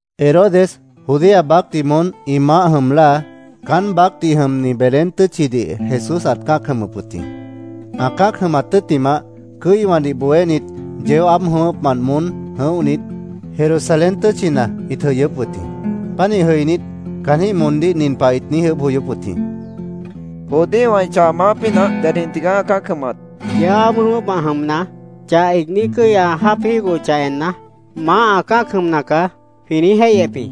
Herodes Judea baácdih moón ĩ maáh jʉm láa, caán baácdih jʉmni Belén tʉ́tchidih Jesús ãt cã́ac jʉmʉp wʉt jĩ. Ã cã́ac jʉmat tʉ́ttimah, cʉ́iwãdih bohénit yeó aáb jʉ̃ʉ́wʉ́pmant moón jʉ̃óhnit, Jerusalén tʉ́tchina ĩt jʉyʉ́p wʉt jĩ. Pánih jʉinít, caanjĩ́h moondíh nin pah ĩt niíj ʉʉ́bh joyóp wʉt jĩ: —¿Judíowã ĩ chah maáh pínah dedjĩh tigaá ã cã́ac jʉmat? Yeó aáb jʉ̃ʉ́wʉ́pmant jʉmna, chah iigní cʉ́i ã jáap jígohochah enna, ‘Maáh ã cã́ac jʉmna caá’, jwĩ niíj jéihyep jĩ.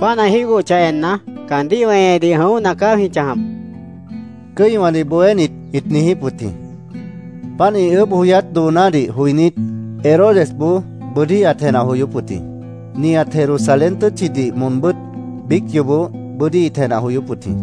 Páant ã jígohochah enna, caandíh weñedih jʉ̃óhna caá jwĩ chãjap, cʉ́iwãdih bohénit ĩt niijíp wʉt jĩ. Páant, ĩ ʉʉ́bh joyát doonádih joinít, Herodesboó bʉ́dí ãt jenah joyóp wʉt jĩ. Nihat Jerusalén tʉ́tchidih moonbʉ́t biíc yoobó bʉ́dí ĩt jenah joyóp wʉt jĩ.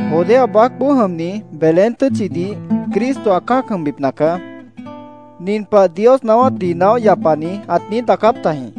—Judea baácboó jʉmni Belén tʉ́tchidih Cristo ã cã́ac jʉmbipna caá. Nin pah Dios naáwátdih naóh yapani ãt niíj daacáp tajĩ: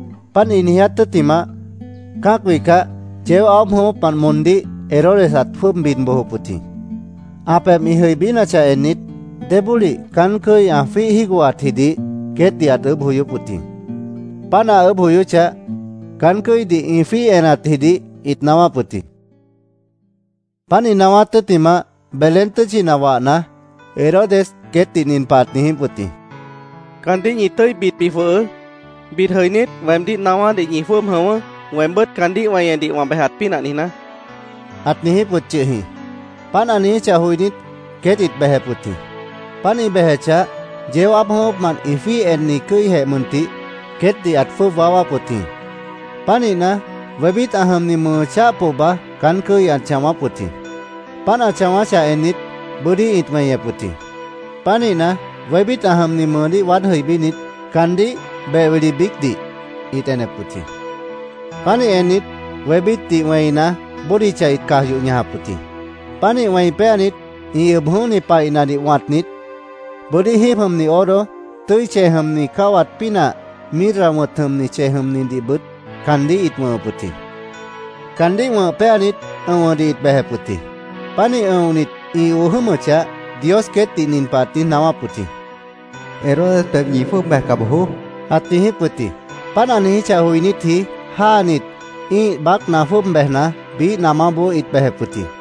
Páant ĩ niiját tʉ́ttimah, cã́ac wihcah, yeó aáb jʉ̃ʉ́wʉ́pmant moondíh Herodes ãt jwʉ́ʉb bid bojop wʉt jĩ. Ã pebh ĩ jʉibínachah ennit, débólih caán cʉ́i ã jwíih jígohatjidih queétdih ãt ʉʉ́bh joyóp wʉt jĩ. Páant ã ʉʉ́bh joyóchah, caán cʉ́idih ĩ jwíih enatjidih ĩt naáwáp wʉt jĩ. Páant ĩ naáwát tʉ́ttimah, Belén tʉ́tchina wahna, Herodes queétdih nin pah ãt niijíp wʉt jĩ: —Caandíh ñi tʉ́i bidbi jwʉhʉʉ́. Bid jʉinít, weemdíh naáwádih ñi jwʉ́ʉb jʉ̃ʉ́wʉ́, weembʉ́t caandíh weñedih wã bejat pínah niijná, ãt niijíp wʉt yʉh jĩ. Páant ã niijíchah joinít, queét ĩt bejep wʉt jĩ. Páant ĩ bejechah, yeó aáb jʉ̃ʉ́wʉ́pmant ĩ jwíih enni cʉ́ijeh mʉntih queétdih ãt jwʉ́ʉb waáwáp wʉt jĩ. Pánihna, wébít ã jʉmni mʉʉ cháh pohba caán cʉ́i ãt chãwáp wʉt jĩ. Páant ã chãwáchah ennit, bʉ́dí ĩt weñep wʉt jĩ. Pánihna, wébít ã jʉmni mʉʉdíh waád jʉibínit, caandíh beh wili biícdih ĩt enep wʉt jĩ. Pánih ennit, wébítdih wẽina, bódicha ĩt caj yoh ñajap wʉt jĩ. Pánih wẽi péanit, ĩ ʉb jʉ̃óhni paihnadih wãtnit, bʉ́dí jíib jʉmni oro, tʉ́i chej jʉmni cáwat pínah, mirra wʉ̃t jʉmni chej jʉmnidihbʉt caandíh ĩt wʉ̃hʉp wʉt jĩ. Caandíh wʉ̃h péanit, ʉ̃wʉdih ĩt bejep wʉt jĩ. Pánih ʉ̃onit, ĩ oo jʉ́mʉchah, Dios queétdih nin pah ãt niíj naáwáp wʉt jĩ: “Herodes pebhboó ñi jwʉ́ʉb bejca bojoó”, ãt niijíp wʉt jĩ. Páant ã niijíchah joinítji jáanit, ĩ́ih baácna jwʉ́ʉb bejna, biíh namáboó ĩt bejep wʉt jĩ.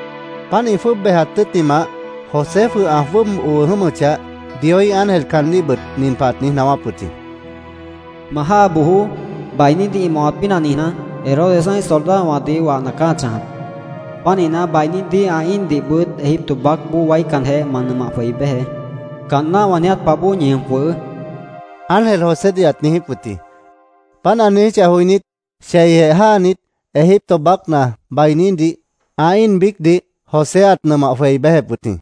Páant ĩ jwʉ́ʉb bejat tʉ́ttimah, José jwʉh ã jwʉ́ʉb oo jʉ́mʉchah, Dioíh ángel caandíhbʉt nin pah ãt niíj naáwáp wʉt jĩ: “Ma jáa bojoó. Bainídih ĩ mawat pínah niijná, Herodes ã́ih soldadowãdih wahna caá ã chãjap. Pánihna, bainídih, ã íindihbʉt Egipto baácboó waícanjeh ma nʉmah jwei béjeé. Caanná wã niiját pah bóo ñi jʉm jwʉhʉʉ́”, ángel Josédih ãt niijíp wʉt jĩ. Páant ã niijíchah joinít, cheijeh jáanit, Egipto baácna bainídih ã íin biícdih José ãt nʉmah jwei béjep wʉt jĩ.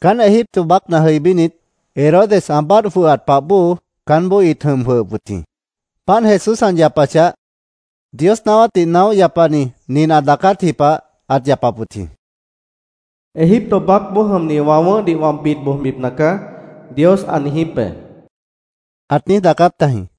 Caán Egipto baácna jʉibínit, Herodes ã báadh jwʉhat pah bóo caánboó ĩt jʉm jwʉhʉp wʉt jĩ. Páant Jesús ã yapachah, Dios naáwátdih naóh yapani nin ã daacátji pah ãt yapap wʉt jĩ: “ ‘Egipto baácboó jʉmni wã wʉ̃ʉ́hdih wã bid bojbipna caá’, Dios ã niijíp be”, ãt niíj daacáp tajĩ.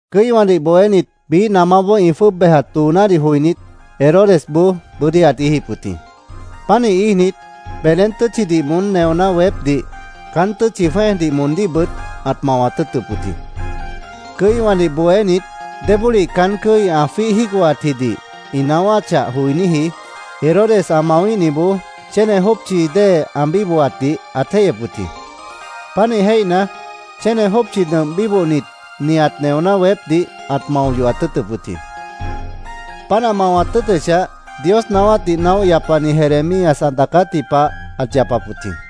Cʉ́iwãdih bohénit biíh namáboó ĩ jwʉ́ʉb bejat doonádih joinít, Herodesboó bʉ́dí ãt íijip wʉt jĩ. Pánih íijnit, Belén tʉ́tchidih moón neoná weépdih, caán tʉ́tchi jwẽ́ejdih moondíhbʉt ãt mawat tʉ́ʉtʉp wʉt jĩ. Cʉ́iwãdih bohénit débólih caán cʉ́i ã jwíih jígohatjidih ĩ naáwáchah joiníji Herodes ã mawíhniboó chéne jópchi dée ã bíbohatdih ãt jéihyep wʉt jĩ. Pánih jéihna, chéne jópchi nʉmp bíbohnit nihat neoná weépdih ãt mao yohat tʉ́ʉtʉp wʉt jĩ. Páant ã mawat tʉ́ʉtʉchah, Dios naáwátdih naóh yapani Jeremías ã daacátji pah ãt yapap wʉt jĩ.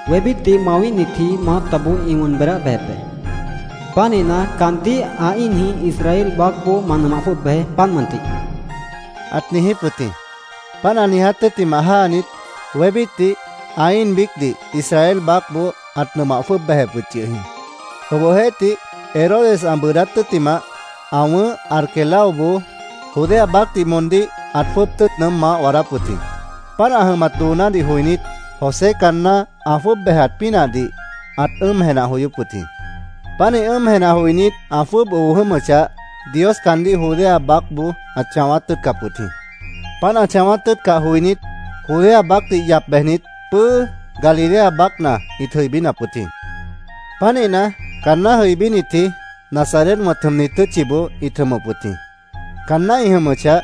“Wébítdih mawíhnitji maátaboó ĩ wʉn beedáh bejep be. Pánihna, caandíh ã íinjĩh Israel baácboó ma nʉmah jwʉ́ʉb bejeé, páant mʉntih”, ãt niijíp wʉt jĩ. Páant ã niiját tʉ́ttimah, jáanit, wébítdih ã íin biícdih Israel baácboó ãt nʉmah jwʉ́ʉb bejep wʉt yʉh jĩ. Obohjeéhtih, Herodes ã bʉʉdát tʉ́ttimah, ã wʉ̃ʉ́h Arquelaoboó Judea baácdih moondíh ãt jwʉ́ʉb tʉ́ʉt nʉʉ́m maáh waadáp wʉt jĩ. Páant ã jʉmat doonádih joinít, José caanná ã jwʉ́ʉb bejat pínahdih ãt ʉ́ʉm jenah joyóp wʉt jĩ. Pánih ʉ́ʉm jenah joinít, ã jwʉ́ʉb oo jʉ́mʉchah, Dios caandíh Judea baácboó ãt chãwát tʉ́ʉtcap wʉt jĩ. Páant ã chãwát tʉ́ʉtcah joinít, Judea baácdih yap bejnit, pʉ́ʉ́ Galilea baácna ĩt jʉibínap wʉt jĩ. Pánihna, caanná jʉibínitji, Nazaret wʉ̃t jʉmni tʉ́tchiboó ĩt jʉmʉp wʉt jĩ. Caanná ĩ jʉmʉchah,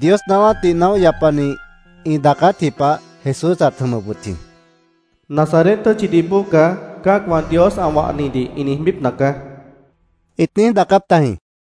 Dios naáwátdih naóh yapanit ĩ daacátji pah Jesús ãt jʉmʉp wʉt jĩ. “ ‘Nazaret tʉ́tchidih bóo caá’, cã́acwã Dios ã wahnidih ĩ niijbípna caá”, ĩt niíj daacáp tajĩ.